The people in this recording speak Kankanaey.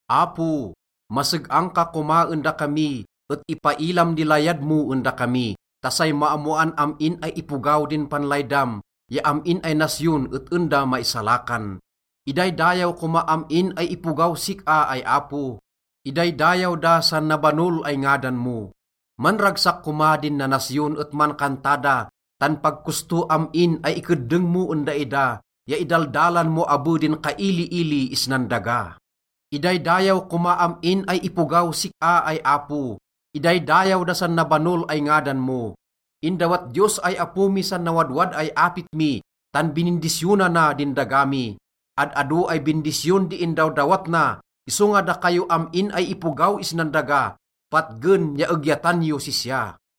Apo, maseg-ang ka koma en dakami et ipailam di layad mo en dakami ta say maammoan am-in ay ipogaw din panlaydam, ya am-in ay nasyon et en da maisalakan. Idaydayaw koma am-in ay ipogaw sik-a ay Apo, idaydayaw da san nabanol ay ngadan mo. Manragsak koma din nanasyon et mankanta da, tan pag kosto am-in ay ikeddeng mo en daida ya idaldalan mo abe din kailiili isnan daga. Idaydayaw koma am-in ay ipogaw sik-a ay Apo, idaydayaw da san nabanol ay ngadan mo. Indawat Diyos ay Apo mi san nawadwad ay apit mi, tan binindisyonana din daga mi. Ad-ado ay bindisyon di indawdawat na, isonga dakayo am-in ay ipogaw isnan daga, patgen ya egyatan yos sisya.